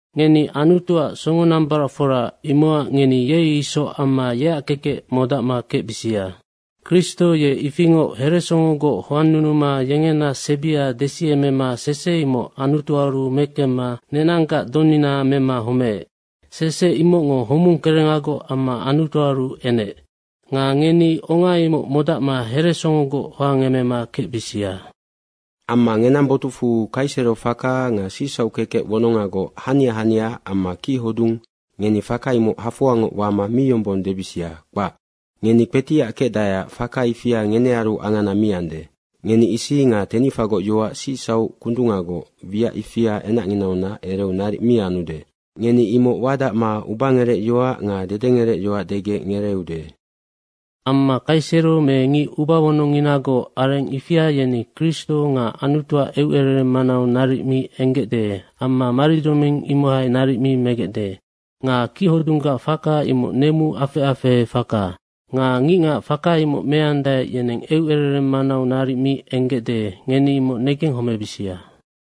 Ngeni Anutuac songonambaracfora, imocac ngeni ye isoc amma yeac kekec modacma kecbisia. Kristo ye ifingoc heresongogoc hoannunuma yengena sebia desiemema sese imoc Anutuaru mekemma nenanggac donina mema homeec. Sese imocngo homung kerengagoc amma Anutuaru enec. Nga ngeni onga imoc modacma heresongogoc hoangemema kecbisia. Amma ngenang botucfu kaisero faka nga sicsauc kekec wonongagoc hania hania amma kichodung, ngeni faka imoc hafoangoc wama mi yombong debisia, kpac. Ngeni kpetiac kecdaeac faka ifia ngenearu angana mi ande. Ngeni isi nga tenicfagoc yoac sicsauc kundungagoc, wiac ifia enacnginaunac ereu naric mi anude. Ngeni imoc wadacma ubangerecyoac nga dedengerecyoac degec ngereeude. Amma kaisero me ngic ubawonongnginagoc areng ifia yeni Kristo nga Anutuac eucerereng manau naric mi enggecde amma maridzoming imohai naric mi megecde. Nga kichodunggac faka imoc nemu afec afehe faka. Nga ngicngac faka imoc meandae, yeneng eucerereng manau naric mi enggecde, ngeni imoc negenghomebisia.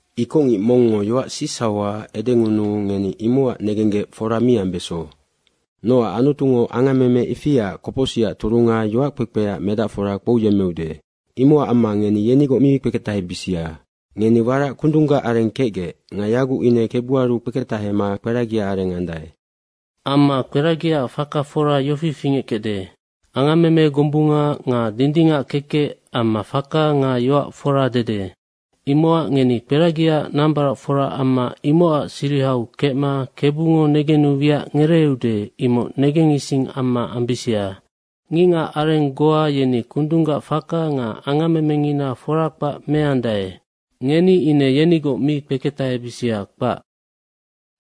Ikocngic mongngo yoac sicsauha edengunuu ngeni imocac negenggec fora mi ambeso. Nocac Anutungo angammeme ifiaac kopocsicac turunga yoackpekpeac medacfora kpouyemmeude. Imocac amma ngeni yenigoc mi kpeketahebisia. Ngeni warac kundunggac areng kecgec nga yaguc ine Kebuaru kpeketahema kperagia areng andae. Amma kperagiaac faka fora yofi fingeckecde, angammeme gombunga nga dindingac kekec amma faka nga yoac fora dede. Imocac ngeni kperagiaac nambaracfora amma imocac sirihau kecma Kebungo negenu wiac ngereeude, imoc negengising amma ambisia. Ngicngac areng goa yeni kundunggac faka nga angammemengina fora kpac meandae, ngeni ine yenigoc mi kpeketahebisia, kpac.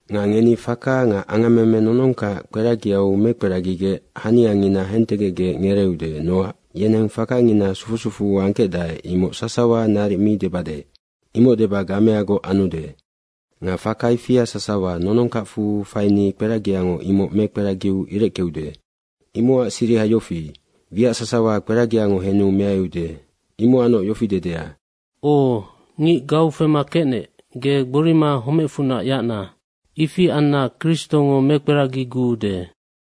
Nga ngeni faka nga angammeme nonongkac kperagiau mekperagigec haniangina hentegecgec ngereeude. Nocac yeneng fakangina sufu sufu angkecdae, imoc sasawa naric mi debade. Imoc deba gameagoc anude. Nga faka ifia sasawa nonongkacfu faini kperagiango imoc mekperagiu ireckeude. Imocac siriha yofi, wiac sasawa kperagiango henu meaiude. Imocacnoc yofi dedea, “O, ngic gau fema kecnec, ge gborima homecfunac yacna. Ifi anna Kristongo mekperagiguude.”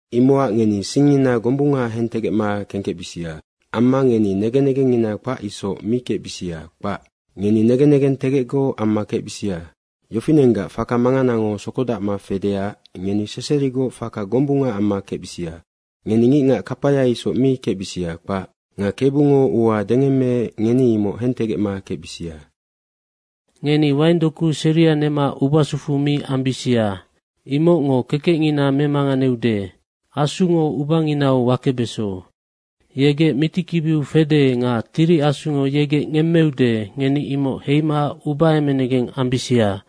Imocac ngeni singngina gombunga hentegecma kengkecbisia. Amma ngeni negen negengngina kpac isoc mi kecbisia, kpac. Ngeni negen negentegecgoc amma kecbisia. Yofinenggac faka manganango sokodacma fedeac ngeni seserigoc faka gombunga amma kecbisia. Ngeni ngicngac kapaya isoc mi kecbisia, kpac. Nga Kebungo ua dengemmeec, ngeni imoc hentegecma kecbisia. Ngeni waingdoku seria nema ubasufu mi ambisia. Imocngo kekecngina memanganeude. Asungo ubanginau wakebeso. Yegec mitikibiu fede nga Tiri Asungo yegec ngemmeude, ngeni imoc heima ubaemenegeng ambisia.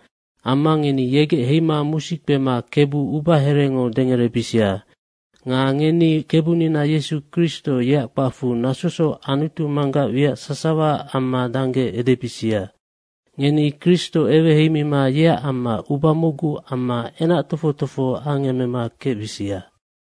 Amma ngeni yegec heima musi kpema Kebu ubaherengo dengerebisia. nga ngeni Kebunina Yesu Kristo, yeac kpacfu nasosoc Anutu Manggac wiac sasawaac amma dangge edebisia. Ngeni Kristo eweheimima yeac amma uba mocgu amma enac tofoc tofoho angemema kecbisia.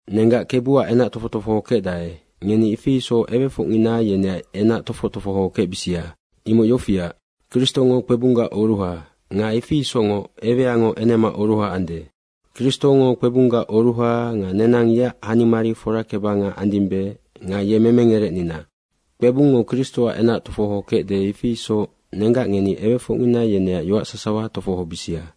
Nenggac Kebuac enac tofoc tofoho kecdae, ngeni ifi isoc ewefocngina yeneac enac tofoc tofoho kecbisia. Imoc yofiac, Kristongo kpebunggac oruha nga ifi isocngoc eweango enemaac oruha ande. Kristongo kpebunggac oruha nga nenang yeac hanimari forakebanga andimbe nga ye Memengerecnina. Kpebungngo Kristoac enac tofoho kecde, ifi isoc nenggac ngeni ewefocngina yeneac yoac sasawa tofohobisia.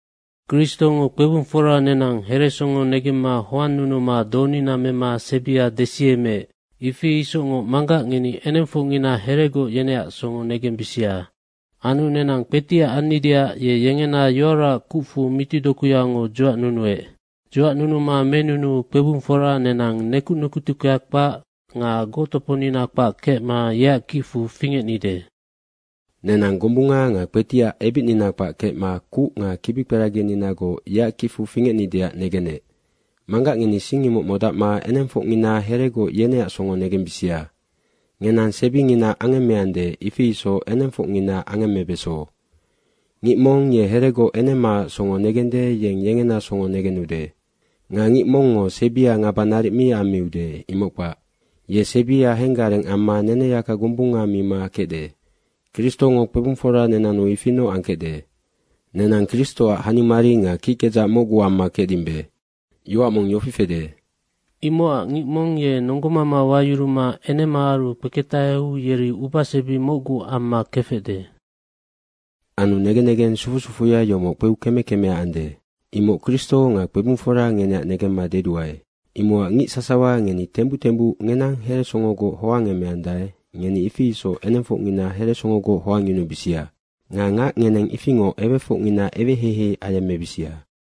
Kristongo kpebungfora nenang heresongo negemma hoannunuma donina mema sebia desiemeec, ifi isocngoc manggac ngeni enengfocngina heregoc yeneac songo negembisia. Anu nenang kpetiac annideac ye yengena yoaraac kucfu mitidokuyango dzuacnunuec. Dzuacnunuma menunuu kpebungfora nenang nekuc nekutuckea kpac nga goctoponina kpac kecma yeac kicfu fingecnide. Nenang gombunga nga kpetiac ebicnina kpac kecma kuc nga kibikperagininagoc yeac kicfu fingecnideac negenec. Manggac ngeni sing imoc modacma enengfocngina heregoc yeneac songo negembisia. Ngenang sebinginaac angemmeande, ifi isoc enengfocnginaac angemmebeso. Ngic mong ye heregoc enemaac songo negende, yeng yengena songo negenude. Nga ngic mongngo sebia ngaba naric mi ammiude, imoc kpac. Ye sebia henggareng amma neneyaka gombunga mima kecde. Kristongo kpebungfora nenannu ifinoc angkecde. Nenang Kristoac hanimari nga kickedzac mocgu amma kecdimbe. Yoac mong yofi fede, “Imocac ngic mong ye nonggomama wayuruma enemaaru kpeketaheu yeri ubasebi mocgu amma kefecde.” Anu negen negeng sufu sufuya yomoc kpeu keme kemea ande. Imoc Kristo nga kpebungfora ngeneac negemma deduae. Imocac ngic sasawa ngeni tembuc tembuc ngenang heresongogoc hoangemeandae, ngeni ifi isoc enengfocngina heresongogoc hoangyunubisia. Nga ngac ngeneng ifingoc ewefocngina eweheihei ayemmebisia.